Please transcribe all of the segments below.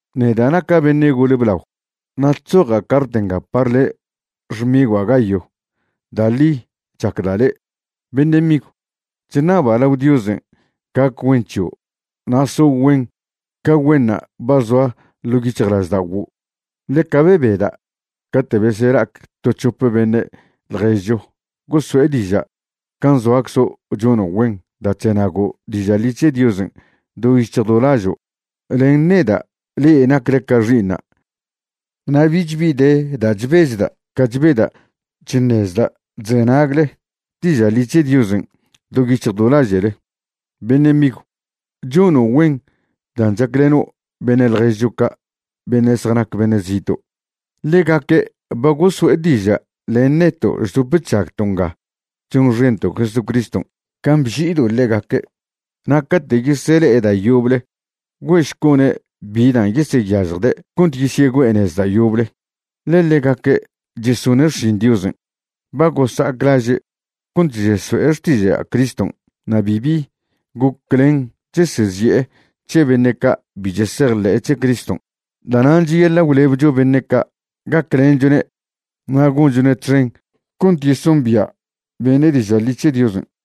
Neda' naca' beṉe' gole blao, na' chzoja' cart nga par le', xmigua' Gayo. Da' ḻi chacda' le'. Beṉe' migw, chṉaba' lao Diosen' gac güen c̱hio' na' so' güen ca güenṉa' ba zoa ḻo' yic̱hjlažda'oguo'. Ḻeca bebeda' cate' besela'ac to c̱hope beṉe' ḻježcho goso'e diža' can' zoaczo' chono' güen da' chzenago' diža' ḻi c̱he Diosen' do yic̱hj do lažo'. Len neda' le'e nacle ca xi'iṉa', na' bich bi de da' chbechda' ca chbeda' chṉezda' chzenagle diža' ḻi c̱he Diosen' do yic̱hj do laže'le. Beṉe' migw, chono' güen dan' chacleno' beṉe' ḻježcho ca' beṉe' zjanac beṉe' zito'. Ḻegaque' ba goso'e diža' len neto' chdop chžagto' nga chonxento' Jesucriston' can' bži'ido' ḻegaque'. Na' cate' yesele'e da' yoble güe'šco'ne' bi dan' yeseyažjde' cont yesyegüe'e nez da' yoble, ḻe ḻegaque' chesone' xšin Diosen'. Ba gosa'ac laže' cont cheso'e xtiža' Criston' na' bibi goclen chesezi'e c̱he beṉe' ca' bi chesejḻe'e c̱he Criston'. Da'nan' cheyaḻa' gwlebcho beṉe' ca', gaclenchwne' na' gonchone' txen cont yesombia' beṉe' diža' ḻi c̱he Diosen'.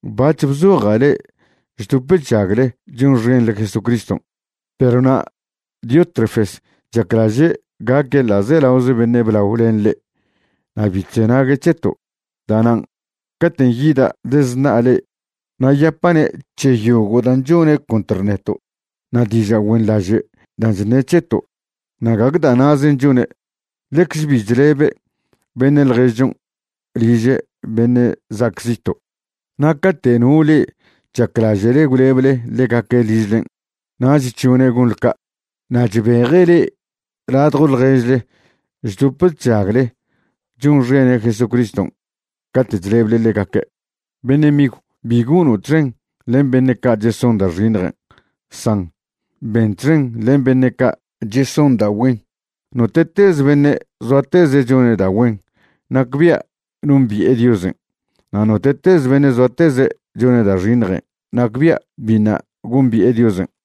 Bac̱h bzoja' le'e chdop chžagle chonxenḻe Jesucriston', perw na' Diótrefes chaclaže' gaque' ḻa'zelaoze beṉe' blao len le'e na' bi chzenague' c̱heto'. Da'nan' caten' yida' dezṉa'a le'e na' yapa'ne' c̱he yogo' dan' chone' contr neto' na' diža' güenḻaže' dan' chṉe' c̱heto'. Na' gague da' na'zen' chone', ḻecz bi chlebe' beṉe' ḻježchon' liže' beṉe' za'ac zito', na' cate' no le'e chaclaže'le gwleble ḻegaque' ližlen' nach chžone' gonḻe ca', na' chbeje' le'e ladjo ḻježle chdop chžagle chonxene' Jesucriston' cate' chleble ḻegaque'. Beṉe' migw, bi gono' txen len beṉe' ca' cheson da' xiṉjen', san ben txen len beṉe' ca' cheson da' güen. Note'tez beṉe' zoateze' chone' da' güen, nacbia' nombi'e Diosen', na' note'tez beṉe' zoateze' chone' da' xiṉjen', nacbia' biṉa' gombi'e Diosen'.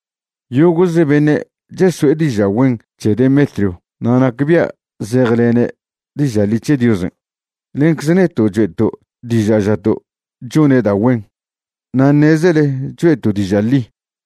Yogo'ze beṉe' cheso'e diža' güen c̱he Demetrio na' nacbia' zejlene' diža' ḻi c̱he Diosen'. Lencze neto' choe'to' diža' žato' chone' da' güen, na' ṉezele choe'to' diža' ḻi.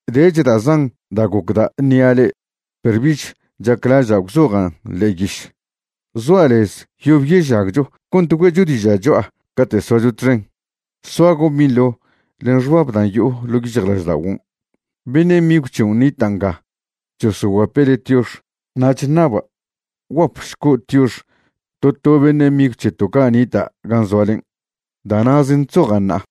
Dech da' zan da' gocda' ṉia' le'e, perw bich chaclaža' gwzojan' ḻe'e yiš. Zoa' lez yob yežagcho cont güe'cho diža' cho'a cate' soacho txen. Soago' binḻo len xbab dan' yo'o ḻo' yic̱hjlažda'oguon'. Beṉe' migw c̱hion' nita' nga chosoguape' le' tiox. Na' chṉaba' gwguapšco' tiox to to beṉe' migw c̱heto' ca' nita' gan' zoalen'. Da' na'zen' chzoja' ṉa'a.